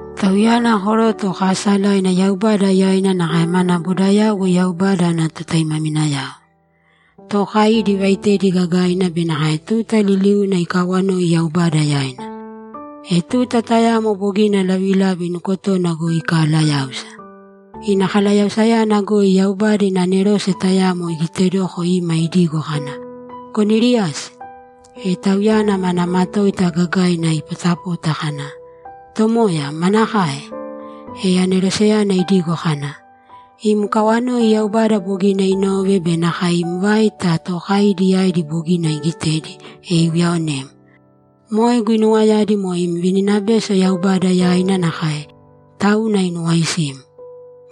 Tauyana koroto kaasalaina Yaubada yaina nakae mana bodayauwo Yaubada ana totaimaminayao. Tookaidi ivaaitedi gagaina be nakae tuta liliuna ikawanoi Yaubada yaina. E tuta tayamo bogina lavilavi nukotona goi ikalayáusa. Ina kalayausayana goi Yaubada ina anerose tayamo igitedoko ima idigo kana, ‘Koniliasi!’ E tauyana mana matoita gagaina ipotapota kana, ‘Tomoya, manakae?’ E aneroseyana idigo kana, ‘Im kawanoi Yaubada bogina inove be nakae im vaita tookaidi yaidi bogina igitedi, e iuyaonem. Moe guinuwayadi moe im vininabeso Yaubada yaina nakae, tauna inuwaisim.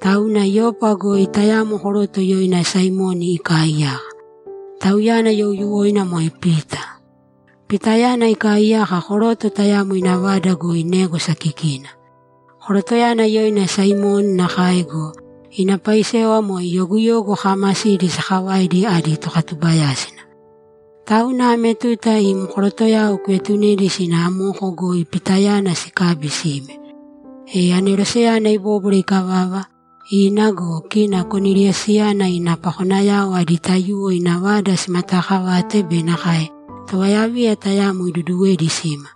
Tauna Yopa goi tayamo koroto yoina Saimoni ikaaiyaka. Tauyana youyuwoina moe Pita. Pitayana ikaaiyaka koroto tayamo ina vada goi négwasa kikina. Korotoyana yoina Saimoni nakae go, ina paisewa moe yoguyogu kaamasidi sakavaidi adi tokatubayásina. Tauna ame tuta im korotoyao kuetunedi sina amoko goi Pitayana sikabi sime.’ E aneroseyana ibóbwara ikavava, ina go, kina Koniliasiyana ina pakonayao adi taiyuwo ina vada simataakavate be nakae tovayaviya tayamo iduduwedi sima.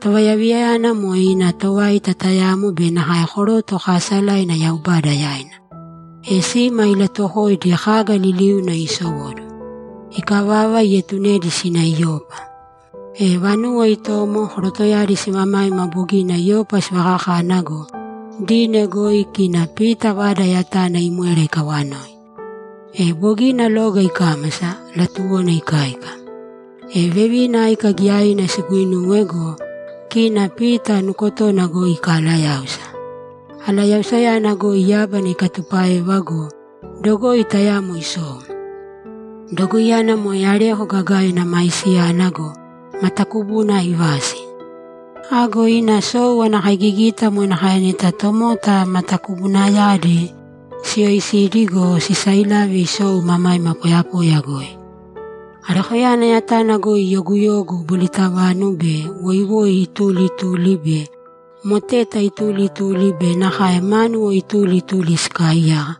Tovayaviyayana moe ina tovaita tayamo be nakae koroto kaasalaina Yaubada yaina. E sima ilatuwokoidi kaga liliuna isowóduwo. Ikavava, ietunedi sina Yopa. E vanuwo itomo, korotoyadi simamaima bogina Yopa sivakakana go, dine goi kina Pita vada yatana imwera ikawanoi. E bogina loga ikámasa; latuwona ikáika. E vevina áika giyaina siguuinuwe go, kina Pita nukotona goi ikalayáusa. Alayausayana goi yábana ikatupáeva go, dogoi tayamo isou. Dogoiyana moe areko gagaina maisiyana go, matakubuna aivasi. Ago ina sou ana kaigigita moe nakae neta tomota matakubunayadi siyoisidi go, sisailave isou imamaima poyapoya goi. Arekoyana yatana goi yoguyogu, bolitavanu be woiwoi ituli ituli, be moteta ituli ituli be nakae mánuwo ituli ituli sikaaiyaka,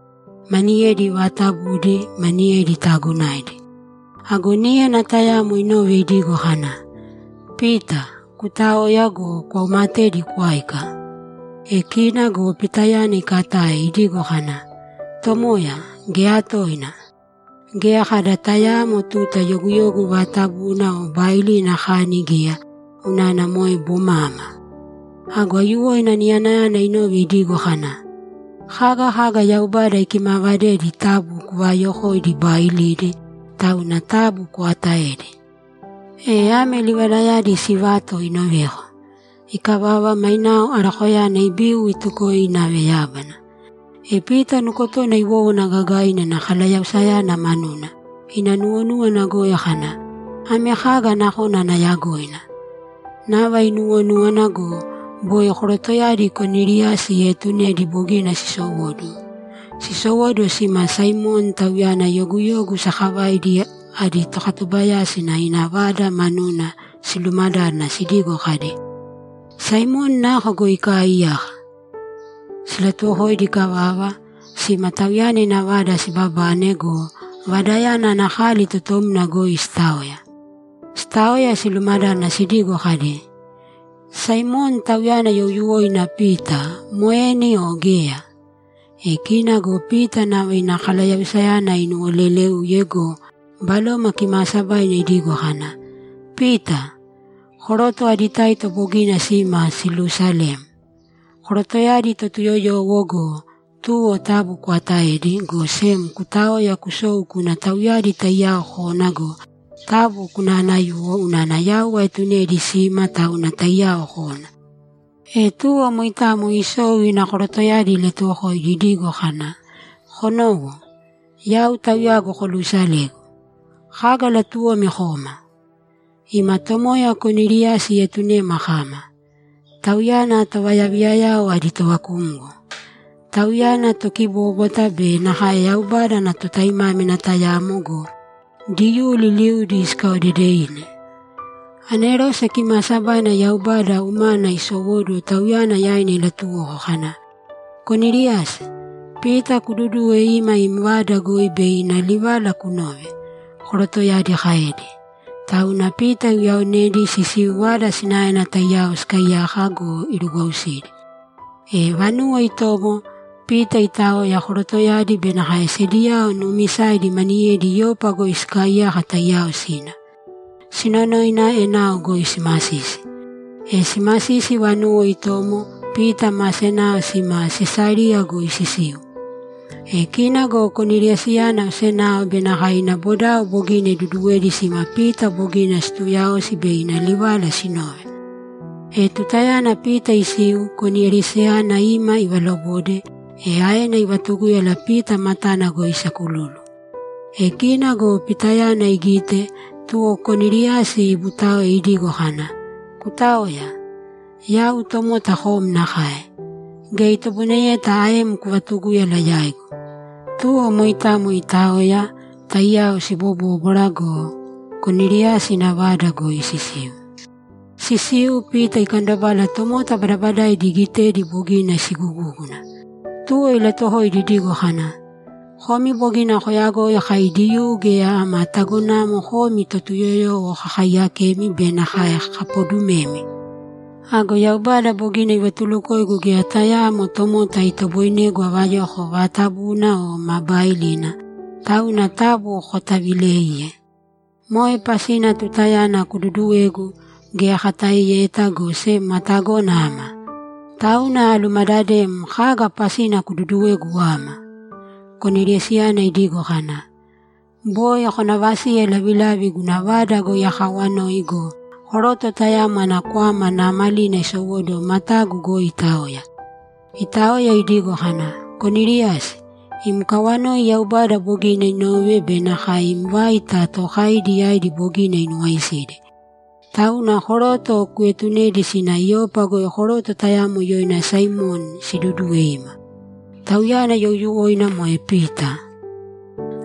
maniyedi vaatabudi, maniyedi taagonaidi. Ago níyana tayamo inove idigo kana, ‘Pita, kutāoya go, kwaumatēdi kwāika!’ E kina go Pitayana ikatae, idigo kana, ‘Tomoya, geya toina! Geya kada tayaamo tuta yoguyogu vaatabuna o baailina akani geya, unana moe bomama.’ Ago aiyuwoina niyanayana inove idigo kana, ‘Kaga kaga Yaubada ikimaavadedi taabu kuvaayokōidi baailidi, tauna taabu kwaatāedi!’ E ame livalayadi sivato inoveko. Ikavava, mainao arekoyana ibiu itukoe inave yábana. E Pita nukotona iwówana gagaina ina kalayausayana manuna; ina nuwonúwana goi kana, ‘Ame kaga nakona ana yagoina?’ Nava inuwonúwana go, boi korotoyadi Koniliasi ieetunedi bogina sisowóduwo. Sisowóduwo sima Saimoni, tauyana yoguyogu sakavaidi adi tokatubayásina, ina vada manuna silumadádana sidigo kadi, ‘Saimoni nako goi ikaaiyaka?’ Silatuwokoidi ikavava, sima tauyana ina vada sibabane go, vadayana ana kali totomna goi sitaoya. Sitaoya, silumadádana sidigo kadi, ‘Saimoni, tauyana youyuwoina Pita, moeni o geya?’ E kina go Pita nava ina kalayausayana inuwoleléuye go, Baloma Kimaasabaina idigo kana, ‘Pita! Koroto adi taito bogina sima siluusalem. Korotoyadi Totuyoyowo go, tuwo taabu kwaatāedi, go sem kutāoya kusōu kūna tauyadi taiyao kōna go, taabu kunaanayūwo unana yau aetunedi sima, tauna taiyao kōna.’ E tuwo moitamo isou ina korotoyadi ilatuwokoidi idigo kana, ‘Konōwo. Yau tauyagu koluusalegu. Kaga latuwomi koma?’ ‘Ima tomoya Koniliasi ietunema kama. Tauyana tovayaviyayao adi tovakumgo. Tauyana tokibóbwata be nakae Yaubada ana totaimámina tayamo go, Diyuu liliudi sikaodedevine. Anerose kimaasabaina Yaubada umana isowóduwo tauyana yaina ilatuwoko kana, “Koniliasi, Pita kududūwe ima im vada goi bei ina livala kunove”’, korotoyadi kaedi. Tauna Pita iuyaonedi sisiu vada sinaena taiyao sikaaiyaka go, irugwausidi. E vanuwo itomo, Pita itaoya, korotoyadi be nakae sediyao nuumisaidi maniyedi Yopa goi sikaaiyaka taiyao sina. Sinonoina, enao goi simasisi. E simasisi vanuwo itomo, Pita ma senao sima Sesariya goi sisiu. E kina go Koniliasiyana osenao be nakae ina bodao bogina iduduwedi sima Pita bogina situuyaosi bei ina livala sinove. E tutayana Pita isiu, Koniliasiyana ima ivalobode, e aena ivatugúyala Pita matana goi isakululu. E kina go Pitayana igite, tuwo Koniliasi ibutáoe idigo kana, ‘Kutāoya! Yau tomota kom nakae. Geya itoboineyeta aem kuvatugúyala yaigu.’ Tuwo moitamo itaoya, taiyao sibobóbwara go, Koniliasi ina vada goi sisiu. Sisiu, Pita ikandobala tomota badabadaidi igitedi bogina sigugúguna. Tuwo ilatuwokoidi idigo kana, ‘Komi bogina koyagoi kai Diyuu geya ama tagonamo komi Totuyoyowo kakaiyakemi be nakae kapodumemi. Ago Yaubada bogina ivatulukoigu geya tayaamo tomota itoboinegu avayoko vaatabuna o ma baailina, tauna taabu kataavilēiye. Moe pasina tutayana kududuwegu, geya akataeyeta, go sem atagona ama. Tauna alumadadem kaga pasina kududuwegu ama?’ Koniliasiyana idigo kana, ‘Boi konavasiye lavilavina guna vada goi akaawanoi go, koroto tayamo ana kwama naamalina isowóduwo matagu goi itaoya. Itaoya idigo kana, “Koniliasi, im kawanoi Yaubada bogina inove be nakae im vaita tookaidi yaidi bogina inuwaisidi. Tauna koroto kuetunēdi sina Yopa goi koroto tayamo yoina Saimoni sidudūwe ima. Tauyana youyuwoina moe Pita.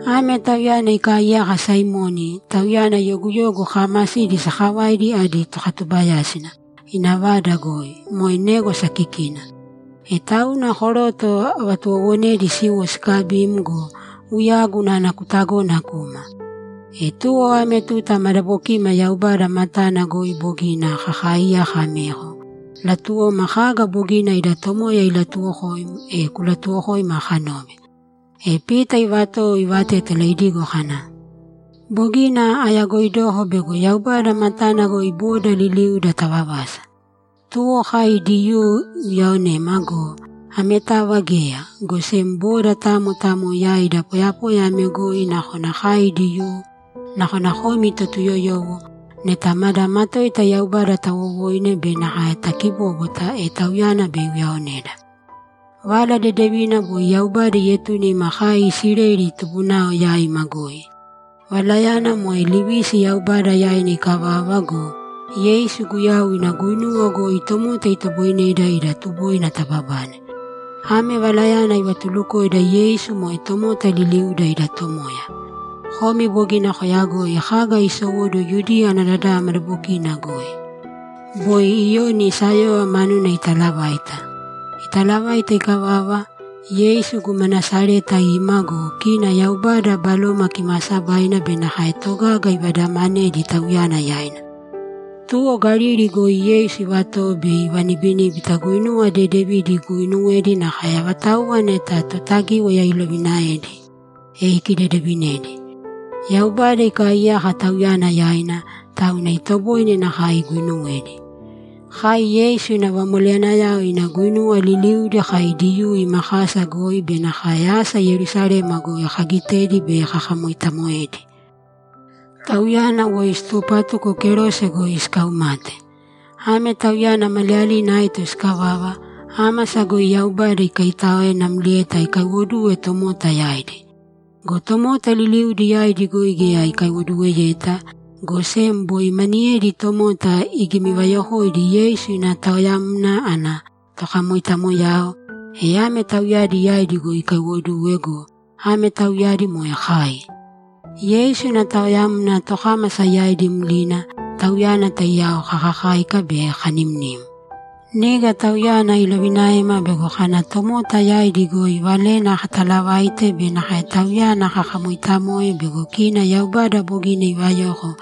Ame tauyana ikaaiyaka Saimoni, tauyana yoguyogu kaamasidi sakavaidi adi tokatubayásina, ina vada goi, moe négwasa kikina.” E tauna koroto avatuwowonedi siwo sikabim go, uyagu unana kutagona kuma. E tuwo ame tuta madabokima Yaubada matana goi bogina kakaaiyaka ameko, latuwoma kaga bogina ida Tomoya ilatuwokoim, e kulatuwokōima kanove.’ E Pita ivatowo ivatétala idigo kana, ‘Bogina ayagoidoko bego Yaubada matana goi boda liliuda tavavasa. Tuwo kai Diyuu iuyaonema go, ametava geya, go sem boda tamo tamo yaida poyapoya ame goi nakona kai Diyuu, nakona komi Totuyoyowo, neta mada matoita Yaubada tawowoine be nakae takibóbwata, e Tauyana bei iuyaoneda. Vala Dedevina boi Yaubada ietune ima kai Isileli tubunao yaima goi. Valayana moe livisi Yaubada yaina ikavava go, Yeisu Guyau ina guinuwa goi tomota itoboineda ida tuboina tababane. Ame Valayana ivatulukoida Yeisu moe tomota liliuda ida Tomoya. Komi bogina koyagoi kaga isowóduwo Yudiya ana dadava madabokina goi. Boi Iyoni sayóyova manuna itaalavaita. Italavaita ikavava, Yeisu guma Nasareta ima go, kina Yaubada Baloma Kimaasabaina be nakae togaga ivadamanedi Tauyana yaina. Tuwo Galili goi Yeisu ivatowo bei ivanibiníbita guinuwa dedevidi iguuinuwedi nakae avatauwa neta Totagíwaya iloviinaedi, e ikidedeevinedi. Yaubada ikaaiyaka Tauyana yaina, tauna itoboine nakae iguinuwedi. Kai Yeisu ina vamoleyanayao ina guinuwa liliudi kai Diyuu ima kasa goi be nakae asa Yerusalema goi kagitedi bei kakamoitamoedi. Tauyana woi situpatuko kerose goi sikaumate. Ame Tauyana maliyalina aito sikavava, ámasa goi Yaubada ikaitáoe namlieta ikaiwoduwe tomota yaidi. Go tomota liliudi yaidi goi geya ikaiwoduweyeta, go sem boi maniyedi tomota igimivayokoidi Yeisu ina taoyamna ana tokamoitamoyao, e ame tauyadi yaidi goi ikaiwoduwe go, ame tauyadi moe kai. Yeisu ina taoyamna tokámasa yaidi mlina, Tauyana taiyao kakakáika be kanimnim. Niga Tauyana ilovinaema bego kana tomota yaidi goi Valena katalavaite be nakae Tauyana kakamoitamoe bego kina Yaubada bogina ivayoko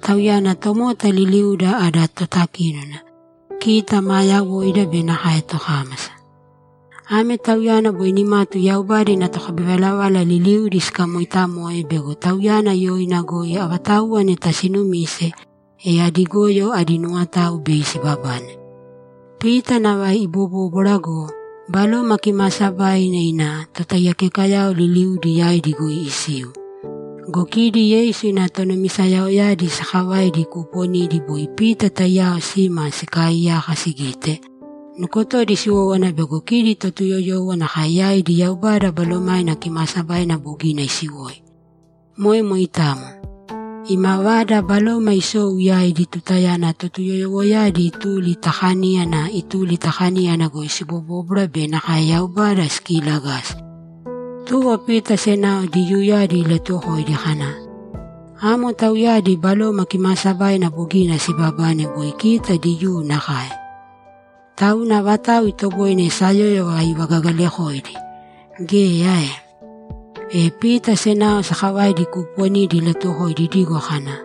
Tauyana tomota liliuda ada totakínona, kita maa yawoida be nakae tokámasa. Ame Tauyana boi nimatu Yaubada ina tokabivalavala liliudi sikamoitamoe bego Tauyana yoina goi avatauwa neta sinumise, e adi goyo adi nuwotao bei sibabane.’ Pita nava ibobóbwara go, Baloma Kimaasabaina ina totaiyakekayao liliudi yaidi goi isiu. Go kidi Yeisu ina tonumisayaoyadi sakavaidi kuuponidi boi Pita taiyao sima sikaaiyaka sigite, nukotodi siwówana bego kidi Totuyoyowo nakae yaidi Yaubada Balomaina Kimaasabaina bogina isiwoi. Moe moitamo. Imavada Baloma isou yaidi tutayana Totuyoyowoyadi ituli ta kaníyana ituli ta kaníyana goi sibobóbwara be nakae Yaubada sikiilagasi. Tuwo Pita senao Diyuuyadi ilatuwokoidi kana, ‘Amo tauyadi Baloma Kimaasabaina bogina sibabane boi kita Diyuu nakae. Tauna avatau itoboine sayóyova ivagagalakoidi? Geya ae?’ E Pita senao sakavaidi kuuponidi ilatuwokoidi idigo kana,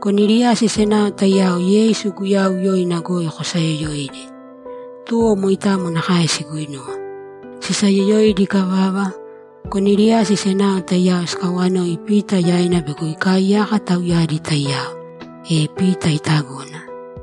‘Koniliasi senao taiyao Yeisu Guyau yoina goi kosayoyōidi.’ Tuwo moitamo nakae siguinuwe. Sisayoyoidi ikavava, Koniliasi senao taiyao sikawanoi Pita yaina bego ikaiyaka tauyadi taiyao. E Pita itagona.